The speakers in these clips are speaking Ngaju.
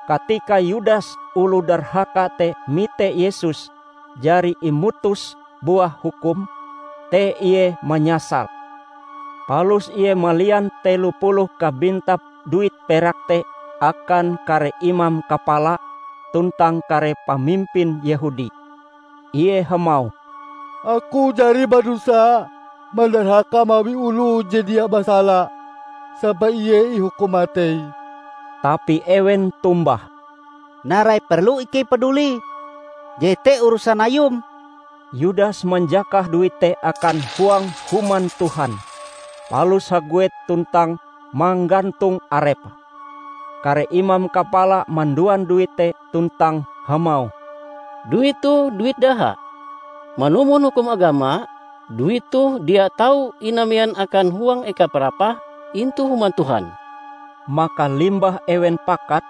Katika Yudas oloh darhaka te mite Yesus jari imutus buah hukum, te ie manyasal. Palus ie malian telo puluh kabintap duit perak te akan kare imam kapala tuntang kare pamimpin Yehudi. Ie hamauh, "Aku jari badosa mandarhaka mawi oloh je dia basala, sampai Ie ihukum matei!" Tapi ewen tombah, "Narai perlu ikei padulie? Jete urusan ayum!" Yudas manjakah duit te akan huang Human Tuhan, palus haguet tuntang manggantong arepe. Kare imam kapala manduan duit te tuntang hamauh, "Duit toh duit daha. Manumon hukum agama, duit toh dia tau inamean akan huang eka parapah intu Human Tuhan." Maka limbah ewen pakat,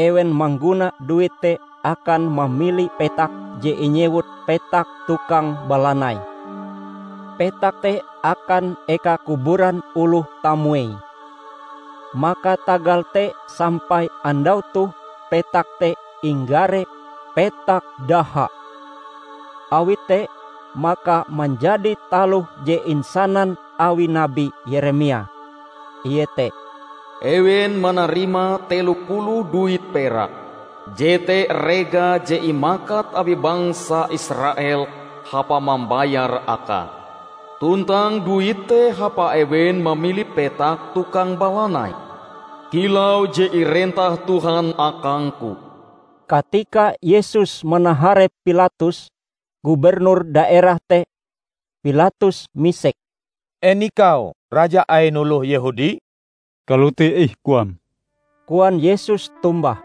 ewen mangguna duit te akan mamili petak je inyewut Petak Tukang Balanai. Petak te akan eka kuburan oloh tamuei. Maka tagal te sampai andau toh petak te inggare "Petak Daha". Awi te, maka manjadi taloh je insanan awi Nabi Yeremia, iete, "Ewen manarima telo puluh duit perak, jete rega je imakat awi bangsa Israel hapa mambayar akae. Tuntang duit te hapa ewen mamili Petak Tukang Balanai, kilau je irentah Tuhan akangku." Katika Yesus manaharep Pilatus, gubernur daerah te, Pilatus misek, "En ikau Raja ain oloh Yehudi?" "Kalote ih koam," koan Yesus tombah.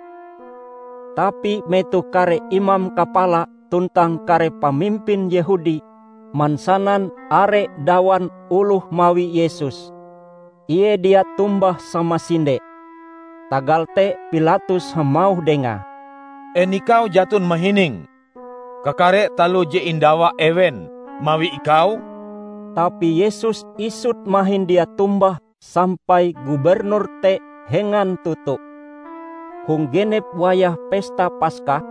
Tapi metoh kare imam kapala tuntang kare pamimpin Yehudi mansanan are dawan oloh mawi Yesus, Ie dia tombah samasinde. Tagal te Pilatus hamauh Dengae, "En ikau jaton mahining kakare taloh je indawa ewen mawi ikau?" Tapi Yesus isut mahin dia tombah sampai gubernur te hengan toto. Hong genep wayah Pesta Paska,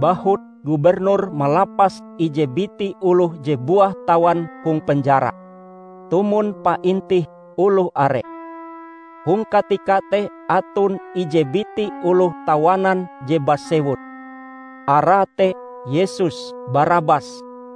bahut gubernur malapas ije biti oloh je buah tawan hong penjara, tumon paintih oloh are. Hong katika te aton ije biti oloh tawanan je basewut. Arae te Yesus Barabas.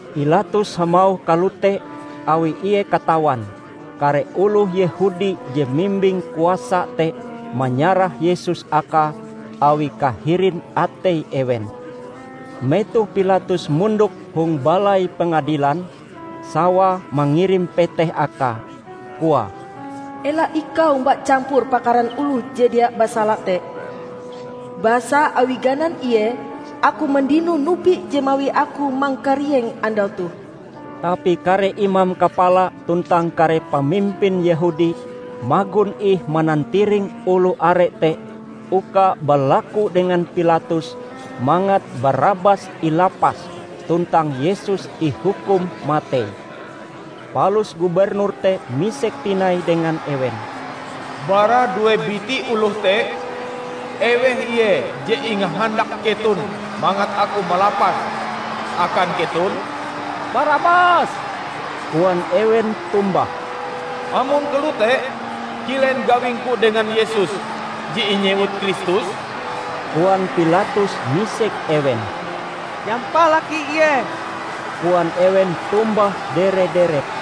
Pilatus hamauh kalote awi ie katawan, kare oloh Yehudi je mimbing kuasa te manyarah Yesus akae awi kahirin atei ewen. Metoh Pilatus mondok hong balai pengadilan, sawae mangirim peteh akae, koae, "Ela ikau omba campur pakaran oloh je dia basala te, basa awi ganan Ie, aku mandino nupi je mawi aku mangkarieng andau toh." Tapi kare imam kapala tuntang kare pamimpin Yehudi magon ih manantiring oloh are te uka balaku dengan Pilatus mangat Barabas ilapas tuntang Yesus ihukum matei. Palus gubernur te misek tinai dengan ewen, "Bara due biti oloh te, eweh ie je ingahandak keton mangat aku malapase akan keton?" "Barabas," koan ewen tombah. "Amon kalote, kilen gawingku dengan Yesus je inyewut Kristus?" koan Pilatus misek ewen. "Nyampalaki Ie!" koan ewen tombah dere-derep.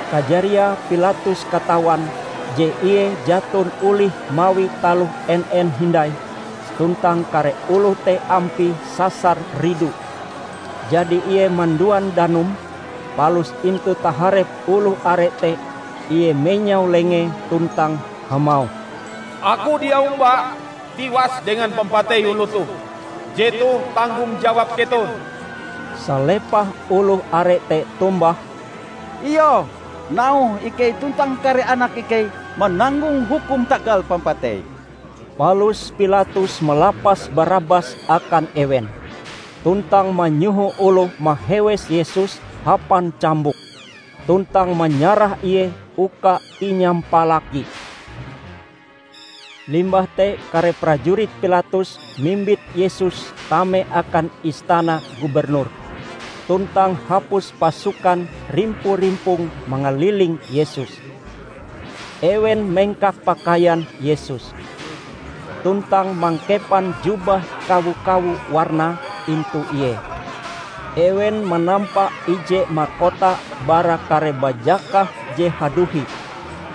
Kajariae Pilatus katawan je ie jaton olih mawi taloh en-en hindai tuntang kare oloh te ampie sasar ridu. Jadi ie manduan danum, palus intu taharep oloh are te ie menyau lengee tuntang hamauh, "Aku dia omba tiwas dengan pampatei oloh toh! Jetoh tanggong jawab keton!" Salepah oloh are te tombah, "Iyoh, nauhe ikei tuntang kare anak ikei mananggong hukum tagal pampateie!" Palus Pilatus malapas Barabas akan ewen, tuntang manyoho oloh mahewes Yesus hapan cambuk; tuntang manyarah Ie uka inyampalaki. Limbah te kare prajurit Pilatus mimbit Yesus tame akan istana gubernur, tuntang hapus pasukan rimpo-rimpong mangaliling Yesus. Ewen mengkak pakaian Yesus, tuntang mangkepan jubah kawo-kawo warnae intu Ie. Ewen manampa ije makota bara kare bajakah je haduhi,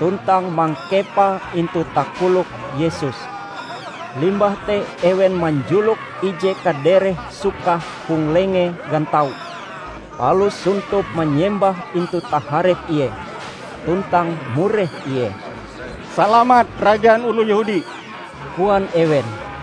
tuntang mangkepae intu takolok Yesus. Limbah te ewen manjulok ije kadereh sukah hong lengee gantau, palus sontop manyembah intu taharep Ie, tuntang mureh Ie. "Salamat Rajan Oloh Yehudi!" koan ewen.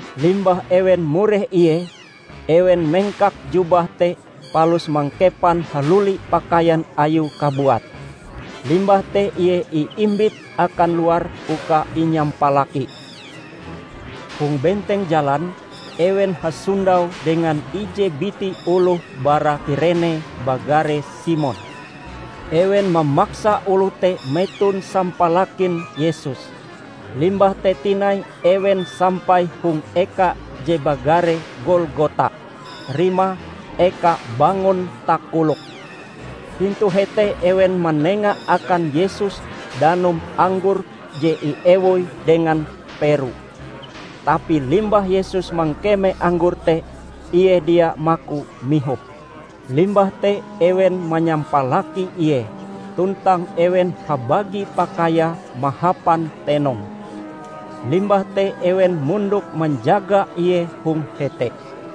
Limbah ewen mureh Ie, ewen mengkak jubah te palus mangkepan haluli pakaian ayue kabuat. Limbah te Ie iimbit akan luar uka inyampalaki. Hong benteng jalan, ewen hasondau dengan ije biti oloh bara Kirene bagare Simon. Ewen mamaksa oloh te meton sampalakin Yesus. Limbah te tinai ewen sampai hong eka je bagare Golgota, rimae "Eka Bangon Takolok". Intu hete ewen manenga akan Yesus danum anggor je iewoi dengan peru. Tapi limbah Yesus mangkeme anggor te, Ie dia maku mihope. Limbah te ewen manyampalaki Ie, tuntang ewen habagi pakaiae mahapan tenong. Limbah te ewen mondok manjaga Ie hong hete.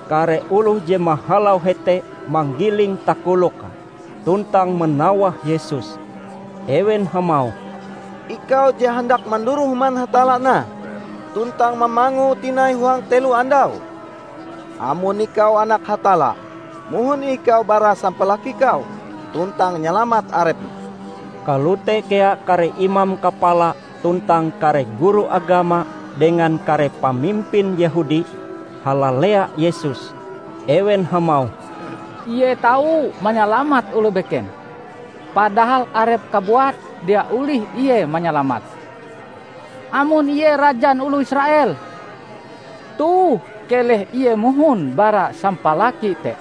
Kare oloh je mahalau hete manggiling takoloke, tuntang manawah Yesus. Ewen hamauh, "Ikau je handak manduroh Human Hatalla nah, tuntang mamangue tinai huang telo andau! Amon Ikau Anak Hatalla, mohon ih ikau bara sampalaki kau, tuntang nyalamat Arepm!" Kalote kea kare imam kapala tuntang kare guru agama dengan kare pamimpin Yehudi halalea Yesus. Ewen hamauh, "Ie tau manyalamat oloh beken, padahal Arepe kabuat dia olih Ie manyalamate! Amon Ie Rajan Oloh Israel, toh keleh Ie mohon bara sampalaki te,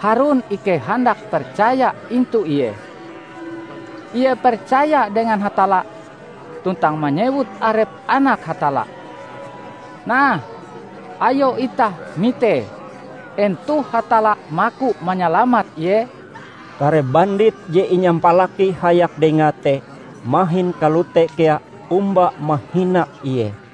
harun ikei handak percaya intu Ie. Ie percaya dengan Hatalla, tuntang manyewut arepe Anak Hatalla. Nah, ayo itah mitee en toh Hatalla maku manyalamat Ie." Kare bandit je inyampalaki hayak Dengae te mahin kalote kea omba mahina Ie.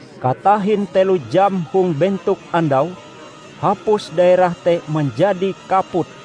Katahin telo jam hong bentok andau, hapus daerah te manjadi kaput.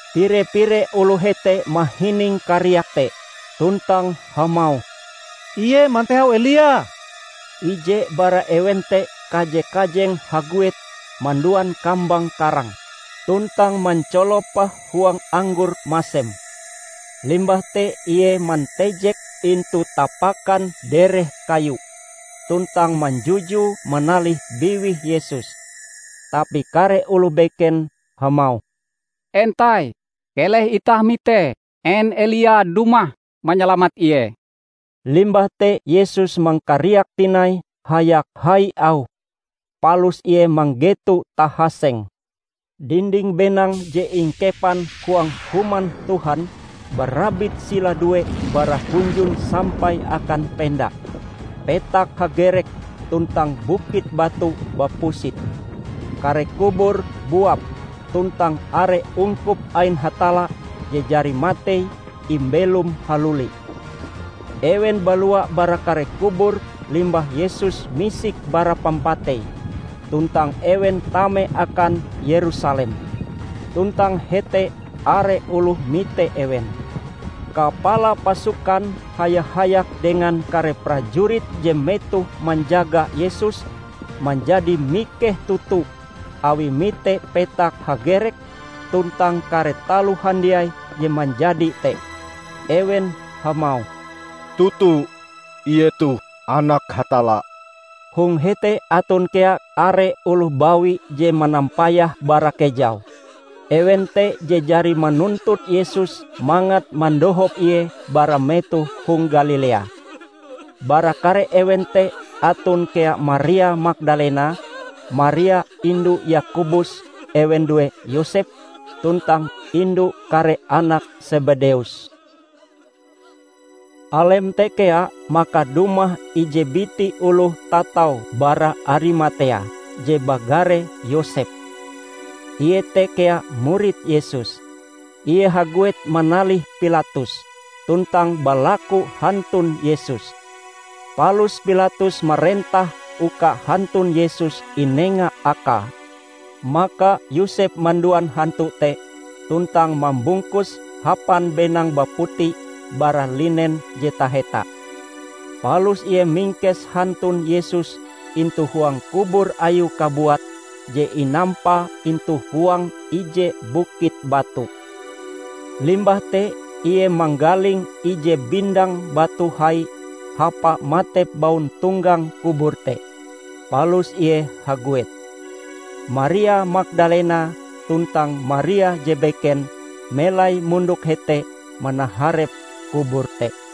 Pire-pire oloh hete mahining kariak te, tuntang hamauh, "Ie mantehau Elia!" Ije bara ewen te kaje-kajeng haguet manduan kambang karang, tuntang manculope huang anggor masem. Limbah te ie mantejeke intu tapakan dereh kayu, tuntang manjujue manalih biwih Yesus. Tapi kare oloh beken hamauh, "Entai, keleh itah mitee en Elia dumah manyalamat Ie!" Limbah te Yesus mangkariak tinai hayak hai auhe, palus Ie manggeto tahaseng. Dinding benang je ingkepan huang Human Tuhan barabit sila due bara hunjun sampai akan pendae, petak hagerek tuntang bukit batu bapusit. Kare kubur buap, tuntang are ungkup ain Hatalla je jari matei imbelom haluli. Ewen balua bara kare kubur limbah Yesus misik bara pampatei, tuntang ewen tame akan Yerusalem. Tuntang hete are oloh mite ewen. Kapala pasukan haya-hayak dengan kare prajurit je metoh manjaga Yesus manjadi mikeh toto awie mite petak hagerek, tuntang kare taloh handiai je manjadi te. Ewen hamauh, "Toto, Ie toh Anak Hatalla!" Hong hete aton kea are oloh bawi je manampayah bara kejau. Ewen te je jari manuntut Yesus mangat mandohop Ie bara metoh hong Galilea. Bara kare ewen te aton kea Maria Magdalena, Maria indu Yakobus ewen due Yosep, tuntang indu kare anak Sebedeus. Alem te kea maka dumah ije biti oloh tatau bara Arimatea, je bagare Yosep. Ie te kea murid Yesus. Ie haguet manalih Pilatus, tuntang balaku hantun Yesus. Palus Pilatus marentah uka hantun Yesus inenga akae. Maka Yosep manduan hantu te, tuntang mambungkuse hapan benang baputi bara linen je taheta. Palus ie mingkes hantun Yesus intu huang kubur ayue kabuat je inampa intu huang ije bukit batu. Limbah te ie manggaling ije bindang batu hai hapa matep bauntonggang kubur te, palus ie haguet. Maria Magdalena tuntang Maria je beken melai mondok hete manaharep kubur te.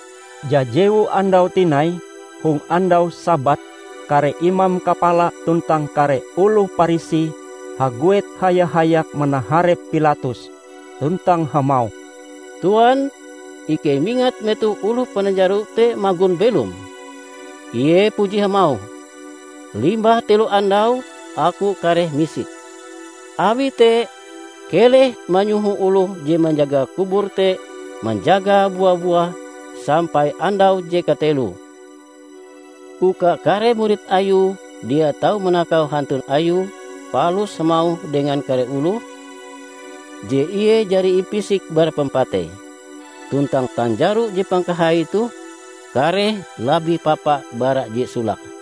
Jajewu andau tinai, hong andau Sabat, kare imam kapala tuntang kare oloh Parisi haguet haya-hayak manaharep Pilatus tuntang hamauh, "Tuan, ikei mingat metoh oloh pananjaro te magon belom, Ie puji hamauh, 'Limbah telo andau Aku kareh misik.' Awi te, keleh manyoho oloh je manjaga kubur te manjagae bua-buah sampai andau je kateloe, uka kare murid Ayue dia tau manakau hantun Ayue palus hamauh dengan kare oloh, je Ie jari impisik bara pampatei. Tuntang tanjaro je pangkahai toh kareh labih papa bara je solake."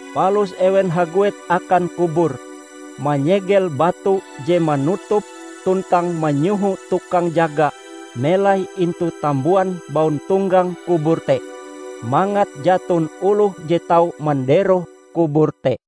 Palus ewen haguet akan kubur, manyegel batu je manutupe tuntang manyoho tukang jaga melai intu tambuan bauntonggang kubur te, mangat jaton oloh je tau manderoh kubur te.